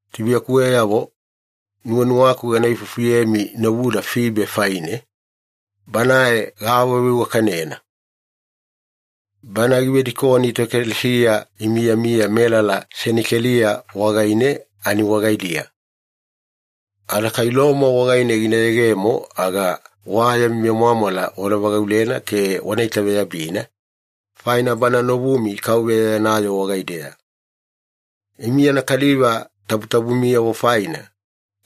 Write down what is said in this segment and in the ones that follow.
Tubuiyakuweyavo, nuwanuwaku gana ifufuyemi novuda Fibe faine, banae gaawaveiwakanena. Bana givedikoni toekalesiya imiyamiya melala Senikeliya wagaine ani wagaidiya. Ada kai Loma wagaine gina yegemo aga wa yami vemwamwala wana vagaulena ke wana itaveyabina, faina bana novumi Kauveya yana yoo wagaideya. Imi yana kaliva tabutabumiyavo faina,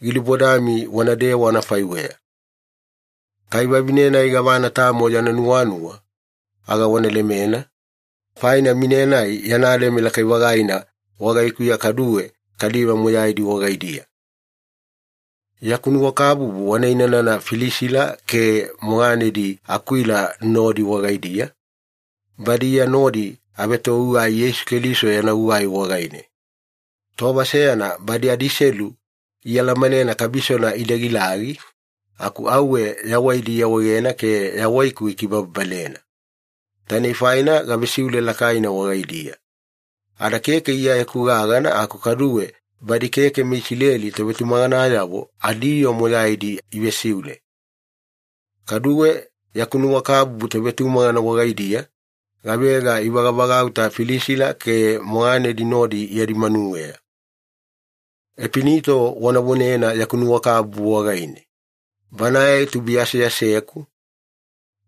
gilubodami wanadewa anafaiweya. Kai vavine-nai gavana tamo yana nuwanuwa aga wana lemena, faina mine-nai yana leme lakai-vagaina wagaikuya kaduwe kaliva moyaidi wagaidiya. Yaku nuwakabubu wana inanana Filisila ke moganedi Akwila nodi wagaidiya, badi Iya nodi avetogugai Yeisu Keliso yana gugai wagaine. Tova seyana badi adiselu ialamanena kabisona ida gilagi, aku auwe yawaidi iawaegena ke yawaiku ikibababalena. Tainei faina gavesiule lakaina wagaidiya. Ada keke Iyayeku gagana aku kaduwe badi keke meIsileli tovetumaganayavo adiyoo moyaidi ivesiule. Kaduwe yaku nuwakabubu tovetumagana wagaidiya, gavega ivagavagauta Filisila ke moganedi nodi yadi manuweya. Epinito wana vonena yaku nuwakabubu wagaine. Banae tubuiya aseaseku,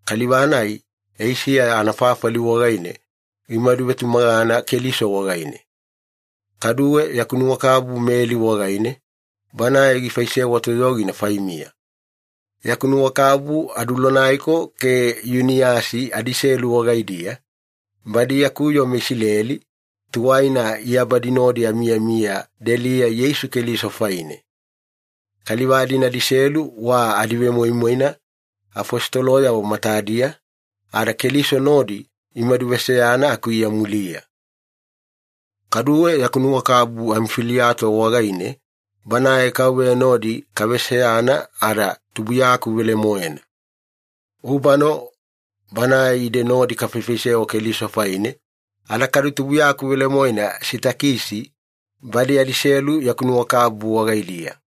kaliva-nai Eisiya anafafali wagaine gimaduvetumagana Keliso wagaine. Kaduwe yaku nuwakabubu Meli wagaine, banae gifaisewa toyogina faimiya. Yaku nuwakabubu Adulonaiko ke Yuniyasi adiselu wagaidiya, badi yaku yoo meIsileli, tuwaina Iya badi nodi amiyamiya deliya Yeisu Keliso faine. Kaliva-dina adiselu wa adivemoimoina afositoloyavo matadiya, ada Keliso nodi imadu veseyana aku Iya muliya. Kaduwe yaku nuwakabubu Amifiliato wagaine, banae Kauveya nodi kaveseyana ada tubuiyaku velemoena. Ubano banae ide nodi kafaifaisewa Keliso faine, ada kadu tubuiyaku velemoena Sitakisi, badi adiselu yaku nuwakabubu wagaidiya.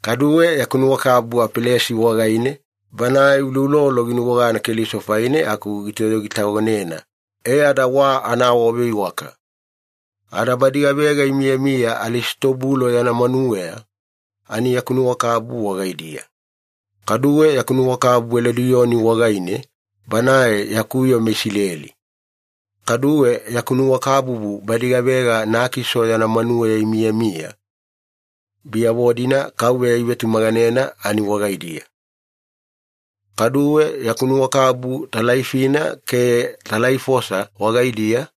Kaduwe yaku nuwakabubu Apelesi wagaine, banae uloulolo ginuwagana Keliso faine aku gitoyogitagonena, e ada wa anaawaveiwaka. Ada badi gavega imiyamiya Alisitobulo yana manuweya, ani yaku nuwakabubu wagaidiya. Kaduwe yaku nuwakabubu Elodiyoni wagaine, banae yaku yoo meIsileli. Kaduwe yaku nuwakabubu badi gavega Nakiso yana manuweya imiyamiya, biyavo-dina Kauveya ivetumaganena ani wagaidiya. Kaduwe yaku nuwakabubu Talaifina ke Talaifosa wagaidiya,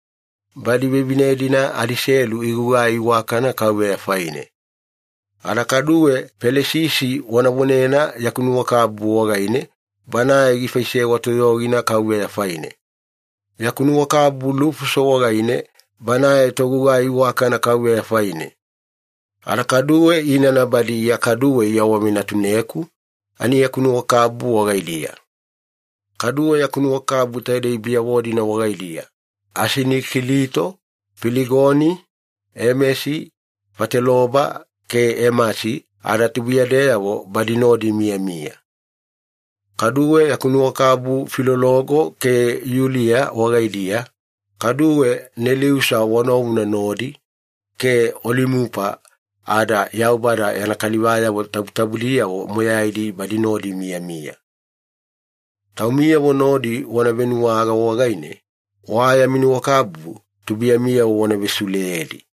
badi vevine-dina adiselu igugai iwakana Kauveya faine. Ada kaduwe Pelisisi wana vonena yaku nuwakabubu wagaine, banae gifaisewa toyogina Kauveya faine. Yaku nuwakabubu Lufuso wagaine, banae togugai iwakana Kauveya faine. Ada kaduwe inana badi Iya kaduwe iawavenatuneku, ani yaku nuwakabubu wagaidiya. Kaduwe yaku nuwakabubu taidei biyavo-dina wagaidiya, Asinikilito, Filigoni, Emesi, Fateloba ke Emasi ada tubuiyadeyavo badi nodi imiyamiya. Kaduwe yaku nuwakabubu Filologo ke Yuliya wagaidiya, kaduwe Neliusa wa novuna nodi, ke Olimupa, ada Yaubada yana kaliva tabutabudiyavo moyaidi badi nodi imiyamiya. Taumiyavo nodi wana venuwaga wagaine, wa yami nuwakabubu tubuiyamiyavo wana vesiuleyedi.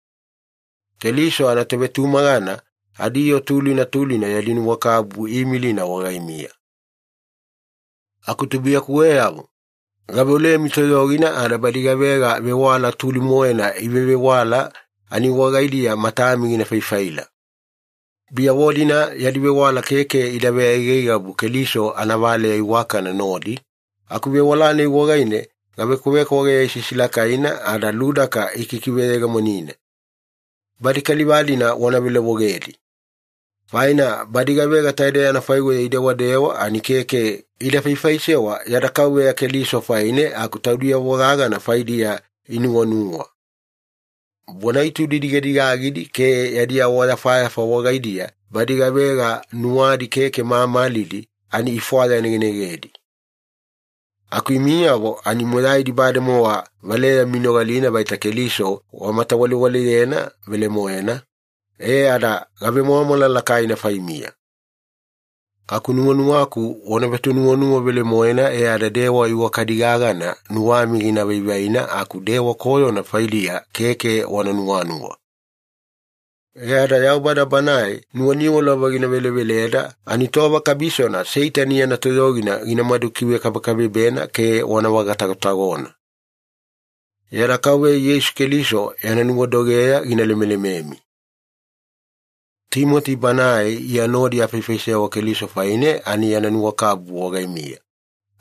Keliso anatovetumagana adiyoo tulina tulina yadi nuwakabubu iimilina wagaimiya. Aku tubuiyakuweyavo, gaveolemi toyogina ada badi gavega vewala tuli-moena ivevewala ani wagaidiya matami gina faifaila. Biyavo-dina yadi vewala keke ida veaigaigabu Keliso anavaleya iwakana nodi, aku vewala-nai wagaine gavekwavekwageya isisilakaina ada ludaka ikikiveyegemonina. Badi kaliva-dina wana velovogedi. Faina badi gavega taidei anafaiweya idewadewa ani keke ida faifaisewa yada Kauveya Keliso faine, aku taudiyavo gagana faidiya inuwanuwa. Bona-itudi digadigagidi ke yadi awayafayafa wagaidiya badi gavega nuwadi keke mamalidi ani ifwayanegenegedi. Aku imiyavo ani moyaidi bademowa valeyami inogalina vaita Keliso wamatawalewaleyena velemoena, e ada gavemwamwala lakaina faimiya. Aku nuwanuwaku wana vetonuwanuwa velemoena e ada dewa iwakadi gagana nuwami gina vaivaina aku dewa koyona faidiya keke wana nuwanuwa. E ada Yaubada Banae nuwaniwalova giveleveleda ani tova kabisona Seitani yana toyogina ginamadu kivekabekabebena ke wana vagatagotagona. Yada Kauveya Yeisu Keliso yana nuwadogeya gina lemelememi. Timoti banae Iya nodi afaifaisewa Keliso faine ani yana nuwakabubu wagaimiya,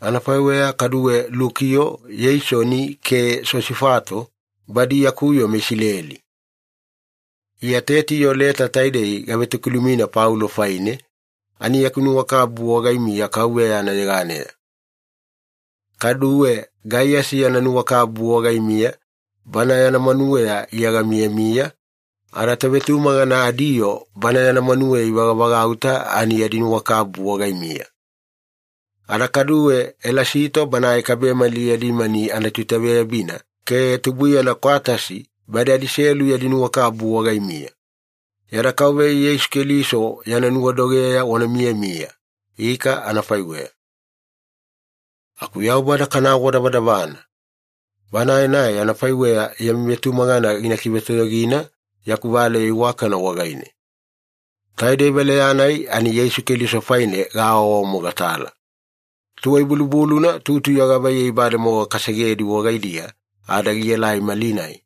anafaiweya kaduwe Lukiyo, Yeisoni ke Sosifato, badi yaku yoo meIsileli. Iya Tetiyo leta taidei gavetokilumina Paulo faine, ani yaku nuwakabubu wagaimiya Kauveya anayeganeya. Kaduwe Gaiyasi yana nuwakabubu wagaimiya, bana yana manuweya Iya gamiyamiya, ada tovetumagana adiyoo bana yana manuweya ivagavagauta ani yadi nuwakabubu wagaimiya. Ada kaduwe Elasito banae kabemali yadi mani anatoitaveyabina ke tubuiyana Kwatasi, badi adiselu yadi nuwakabubu wagaimiya. Yada Kauveya Yeisu Keliso yana nuwadogeya wana miyamiya. Ika anafaiweya. Aku Yaubada kana awadavadavana. Banae-nai anafaiweya yami vetumagana gina kivetoyogina yaku valeya iwakana wagaine. Taidei valeya-nai ani Yeisu Keliso faine gaawaawamogatala. Tuwai-bulubuluna tutuya gavaiyei bademowa kasegedi wagaidiya ada gielai malinai,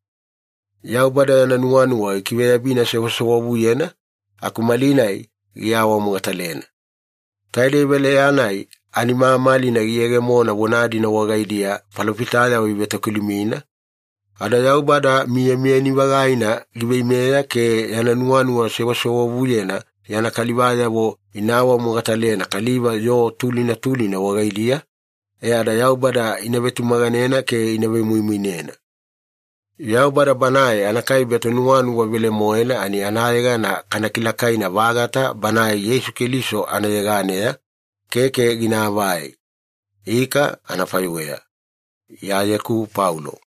Yaubada yana nuwanuwa gikiveyabina sewasewavuyena, aku malinai giawamogatalena. Taidei valeya-nai ani mamalina giyegemona vona-dina wagaidiya falofitayavo ivetokilumina, ada Yaubada miyamiyani-vagaina giveimeya ke yana nuwanuwa sewasewavuyena yana kalivayavo ina awamogatalena kaliva yoo tulina tulina wagaidiya, e ada Yaubada ina vetumaganena ke ina vemoimoinena. Yaubada Banae anakaibe Tonuwanuwa velemoena ani anayegana kana kilakaina-vagata Banae Yeisu Keliso anayeganeya, keke ginaavai. Ika, anafaiweya. Iyayeku Paulo